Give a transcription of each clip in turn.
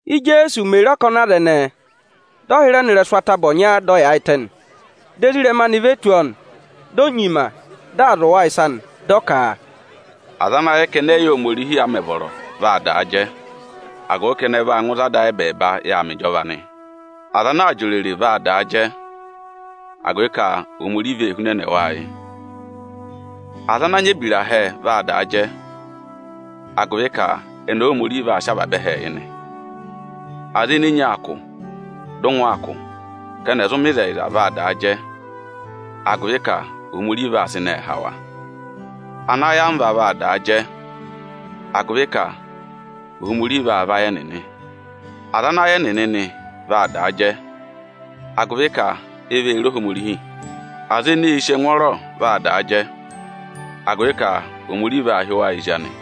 Íjeesu mè re ọkọnị aza ẹnẹẹ, dị ọ hịrẹ nọ ịrẹsụ ataba ọnya, dị ọ yaayịtẹ nị. Dị ezirẹma anị ve tù ọọ nị. Di o nyima, dị aa zụ̀ wa ịsa nị, dị ọ ka: “Aza ana yẹ ka ẹnị ẹ̀ yị yẹ Ohomorihi a mẹ̀ vọrọ, vaa daa jẹ, agụvị ka ẹnị ẹ vaa ngụ ịzị Ada ayị ẹbẹẹba yà aa mẹ ịjọva nị. Aza ana aa jị òrèrè vaa da jẹ, agụvị ka Ohomorihi vee hunẹnẹ wa ayị. Aza ana nyị ebira hẹẹ vaa daa jẹ, agụvị ka ẹnị Óhomorihi vaa sị avaba ẹhẹẹ yị nị. Aza ene enyi aa kụ̀, dị ụngwẹ aa kụ̀ ka ẹnị ẹ̀ zụ mẹ ịzẹyịza vaa daa jẹ, agụvị ka Ohomorihi vaa vayị ẹnịnị. Anayamva vaa daa jẹ, agụvị ka Ohomorihi vaa vayị ẹnịnị. Aza ana ayị ẹnịnị nị vaa daa jẹ, agụvị ka e vee re Ohomorihi. Aza eneē sì ẹngwọọrọ vaa daa jẹ, agụvị ka Ohomorihi vaa hị́ wa ezi anị.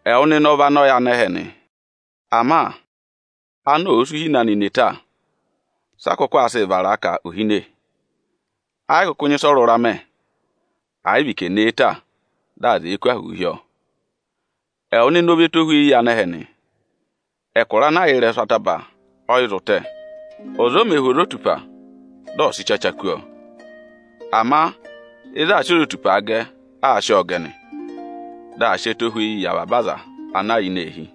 “Ẹwụ nịnị ọ vị anọ yị anẹhẹ nị. Ama anọ ọ̀ọ sị uhine anị ne ta, sị a kụkụ aa sịị vara a ka ò hine? Ẹ yị kụkụ nyị ịsị ọ rụra mẹ, à yị vị ka è ne e ta, dị aza ẹ̀ẹ kụ́ ahụụ hi ọọ. Ẹwụ nịnị ọ vị ẹtohweyi yị anẹhẹ nị. Ẹkụra ana yà ịrẹsụ ataba, ọ yị zụ tẹ. Ọza o mē hú ozotupa, dị ọ sị ịchacha kú ọọ; ama ịzị aā sị ozotupaa gẹ, aa sị ọọ gẹ nị. Dị aa sị ẹtohweyi yị avaba aza ana yà ini eehi.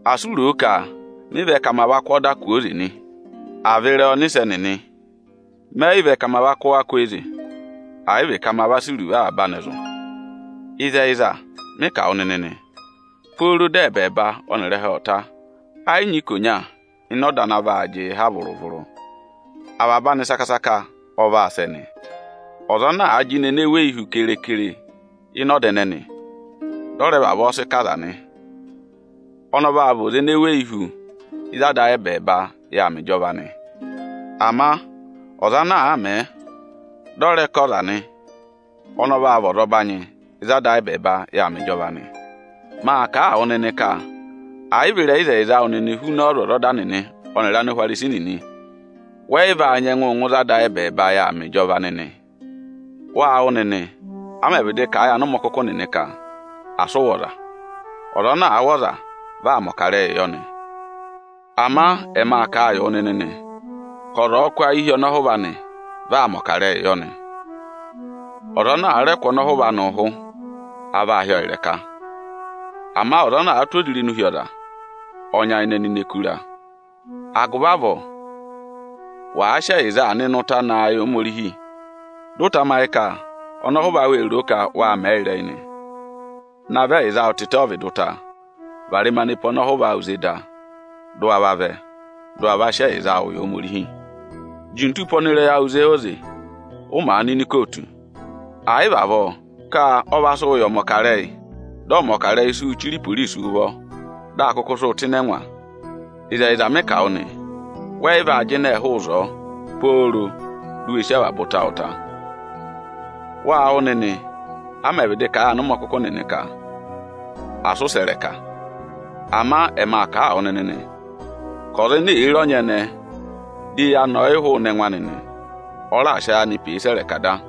“Asị u roo ka mị vẹ ka ma va kụ́ ọda kwooze nị, à vị ịrẹyị ọnịsẹ nịnị. Mẹ yị vẹ ka ma va kụ́ wa kwooze, ẹ̀ yị vị ka ma va sị iruvo avaba anị zụ̀. Ịzẹyịza, mị kà wụ nịnị nị, pooro dị ẹbẹẹba ọnịrị ẹhẹ ọ̀ ta, ẹ yị nyị ikonya ịnị ọda ana vaa jịị ha vụrụ-vụrụ. Avaba anị saka-saka ọ vaa sẹ nị. Ọza ana àa jịnẹ ene weyi hu kere-kere ịnị ọda ẹnẹnị, dị ọ rẹ vavọọ sị kọ aza nị, ọnị ọ vaa vị ọza ene weyi hu ịzị Ada ayị ẹbẹẹba yà aa mẹ ịjọva nị. Ama ọza ana àa mẹ̀ ẹ, dị ọ rẹ kọ ọ yị aza nị, ọnị ọ vaa vị ọzọbanyị ịzị Ada ayị ẹbẹẹba yà aa mẹ ịjọva nị. Maa kà a wụ nịnị ka ẹ̀ yị vị ịzẹyịza awụ nịnị huna ọ́ọzwọzọda nịnị ọnịrị Áanihwarisi nịnị, wẹ yị va nyẹngụ ngụ ịzị Ada ayị ẹbẹẹba yà aa mẹ ịjọva nịnị.” “Wâ wụ́ nịnị, a mẹ̀ vịdị kà a yị anụmọkụkụ nịnị ka, ‘Asị ụ wụ̀ ọza. Ọza ana àa wụ̀ ọza, vị aa mẹ̀ ọkarẹyị yọ nị.’ Ama ẹ ma kà a yị wụ nịnị nị ka ọza ọ̀ọ kụ́ ayị hi ọnọhụva anị, vị aa mẹ̀ ọkarẹyị yọ nị. Ọza ana àa rẹ kụ̀ ọnọhụva anị ụhụ, a vaa hị́ ọọ ịrẹka; ama ọza ana àa tụ́ ozirenu hi ọza, ọ nyayịnẹ nọ ini ẹkụra. Agụvị avọọ, wàa sị ẹyịza aa nọ ịnị ụta naa yị Ohomorihi, dị ụ tamayị ka ọnọhụva awụ ee roo ka wâ mẹ̀ ọnị ịrẹyị nị, navọ ẹyịza awụ tịtẹ ọ́vịdị ụta, varẹma ne pe ọnọhụva awụ ze da, dị ụ wa vavẹ, dị ụ wa va sị ẹyịza awụ yị Ohomorihi. Juntu pe ọnịrẹyị awụ ze óze, ụ màa nọ ini ikootu, ẹ̀ yị va avọọ ka ọ va sị wụ yị ọmọkarẹyị, dị ọmọkarẹyị sị wụ́ chire iporisi ụvọ, dị a kụkụ sị wụ tụ́ ịnị ẹngwa. Ịzẹyịza mị kà a wụ nị, wẹ yị vaa jịnẹ hụụ ịzọọ, pooro di u we sí avaba ụta awụ ta.” “Wâ wụ́ nịnị, a mẹ̀ vịdị kà a yị anụmọkụkụ nịnị ka, ‘Asị ụ sẹ̀ ịrẹka!’ Ama ẹma kà a wụ nịnị nị ka ọza ene èe re ọnyẹnẹẹ, di eyi anị ọ̀ yị hụụnị ẹngụ anị nị, ọ raà sị ayị anị pee sẹ̀ ịrẹka da.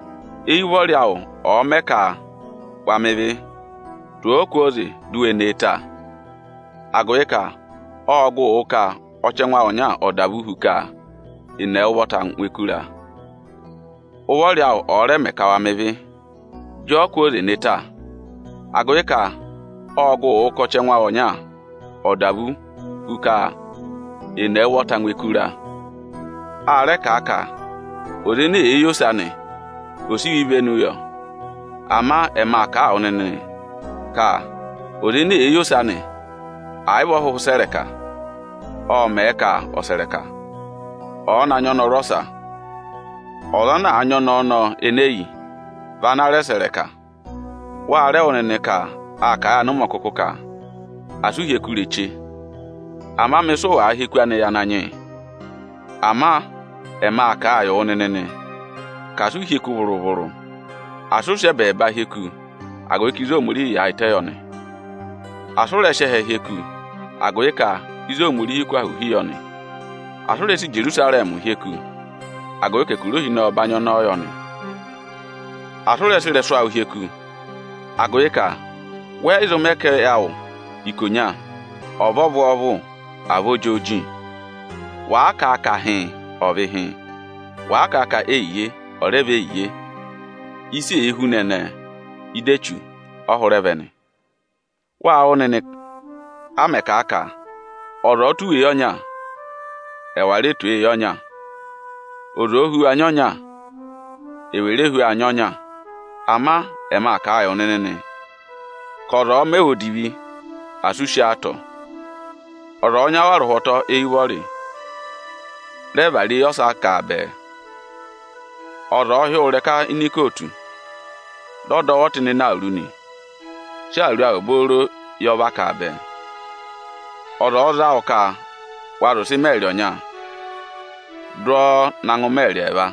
Eyi ụvọrị awụ ọ̀ọ mẹ ka wa mẹ ịvị, tụ̀ ọ kwooze, di u we ne e ta! Agụvị ka ọ́ọ gụụ wụ ka ọchẹngụ awụ ọnya ọ̀ dà vú hu ka è ne ẹwụ ụvọta ngụ ẹkụra. Ụvọrị awụ ọ̀ọ rẹ mẹ ka wa mẹ ịvị, jị ọ kwooze ne ta! Agụvị ka ọ́ọ gụ wụ ka ọchẹngụ awụ ọnya ọ̀ dà vú hu ka è ne ẹwụ ụvọta ngụ ẹkụra.” “A rẹ kà a ka: ‘Ọza ene èe yi ose anị, ọ̀ sị iwe ivenu yọ!’ Ịkọ 7.10,11Ama ẹma kà a wụ nịnị nị ka ọza ene èe yi ose anị, ẹ̀ yị vị ọ hụhụ sẹ̀ ịrẹka, ọ́ọ mẹ̀ ẹ ka ọ̀ sẹ̀ ịrẹka, ọ̀ọ na nyị ọnọrụ ọsa. Ọza ana àa nyị ọnẹẹ ọnọọ ene e yi, vị ana rẹ sẹ̀ ịrẹka.” “Wa rẹ wụ́ nịnị ka â kà a yị anụmọkụkụ nịnị ka: ‘Asị ụ hyeku ireche, ama mẹ ịsị ụ wàa hyeku anị yị Ananyị yị!’ Ama ẹma kà a yị wụ nịnị nị ka asị ụ hyeku vụrụ-vụrụ; asị ụ sị ẹbẹẹba hyeku, agụvị ka ịzị Ohomorihiī yaayịtẹ yọ nị! Asị ụ rẹ sị ẹtẹ hyeku, agụvị ka ịzị Ohomorihiī kụ́ ahụụ hi yọ nị! Asị ụ rẹ sị Ijerusarẹmị hyeku, agụvị ka ẹkụra Ohinọyị ọbanyị ọnọọ yọ nị! Asị ụ rẹ sị ịrẹsụ awụ hyeku, agụvị ka wẹ yị zụ mẹ ka ẹyị awụ ikonya ọ̀ vị ọvwọọvụ, à vị ojooji! Wàa kà a ka ‘Hịịn’, ọ̀ vị hịịn; wàa kà a ka ‘Eyiye’, ọ̀ rẹ yị vị eyiye! Ịsị èe si huna ẹnẹẹ, ịdị Echu ọ hụrẹ vẹ nị.” Wâ wụ́ nịnị, a mẹ̀ kà a ka, “Ọza ọ̀ọ tụ̀ wụ eyi ọnya, ẹwà rẹ tụ̀ ọ eyi ọnya; ọza òo hu wu anyị ọnya, ewè re hu ọ anyị ọnya Ama ẹma kà a yị wụ nịnị nị ka, ọza ọ̀ọ mẹ wụ odivi, asị u sí ọ atọ! Ọza ọ̀ọ nya wụ arụhwọtọ eyi ụvọrị, rẹ vara eyi ọsa kà a bẹẹ. Ọza ọ̀ọ hị́ wụ ịrẹka ini ikootu, dị ọ dọ wụ ọtịnịnẹ awuru nị, sị awuru awụ obooro yọ vakaa bẹẹ. Ọza ọ̀ọ za wụ ka wa zị ụsẹ ikiromita ọnya, dụ ọ na gụ ikiromita ẹẹva.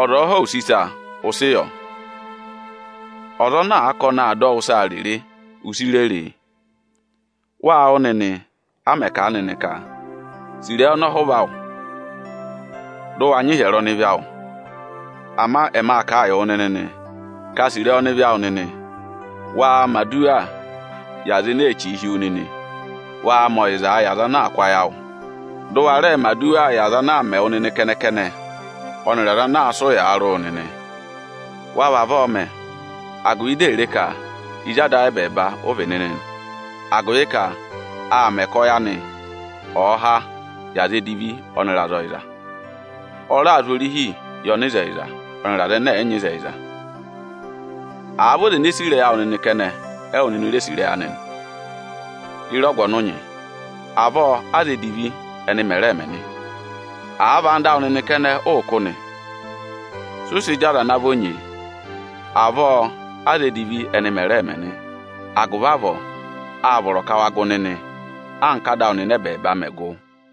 Ọza ọ̀ọ họ̀ wụ use ịsa, ụ sị yọ. Ọza ana àa ka ọnị aa dọ wụ ịsaa rere, u si rere e.” “Wâ wụ́ nịnị, a mẹ̀ kà a nịnị ka: ‘Sì ịrẹyị ọnọhụva, dị ụ wa nyị ịhyẹrẹ ọnịvị awụ!’ Ama ẹma kà a yị wụ nịnị nị ka, sì ịrẹyị ọnịvị awụ nịnị, waa mẹ̀ aduwaa yị aza ene ee chìi hi wu nịnị, waa mẹ ọyịzaa yị aza anaā kụ́ ayị awụ nịnị! Dị ụ wa rẹẹ mẹ̀ aduwaa yị aza ana aa mẹ wụ nịnị kẹnẹ-kẹnẹ, ọnịrị aza ana aa sị ụyaa rị wụ nịnị! Wa vavọọ mẹ agụvị dị è re ka ezi Ada awụ ẹbẹẹba ụ vị nịnị nị, agụvị ka aa mẹ ka ọyị anị ọ̀ọ háa yị aza edivi ọnịrị aza ọyịza. Ọ raa zụ̀ orihii yị ọnịzẹyịza ọnịrị aza ẹnẹ ẹ̀yị nyị ịzẹyịza. Àa vị ọza ene sì ịrẹyị awụ nịnị kẹnẹ, ẹwụ nịnị re sì ịrẹyị anị nị, ye re ọgụ ọnị ụ nyị? Avọọ aza edivi ẹnị mẹ̀ rẹẹ̄ mẹ nị. Àa vị ẹyịnyara awụ nịnị kẹnẹ, ụụ̄ kụ́ nị, sị ụ sị jị aza ana vọ nyee? Avọọ aza edivi ẹnị mẹ̀ rẹẹ̄ mẹ nị. Agụvị avọọ, áa vọrọ ka wa gụ nịnị, anka Áda awụ nịnị ẹbẹẹba mẹ̀ gụ.”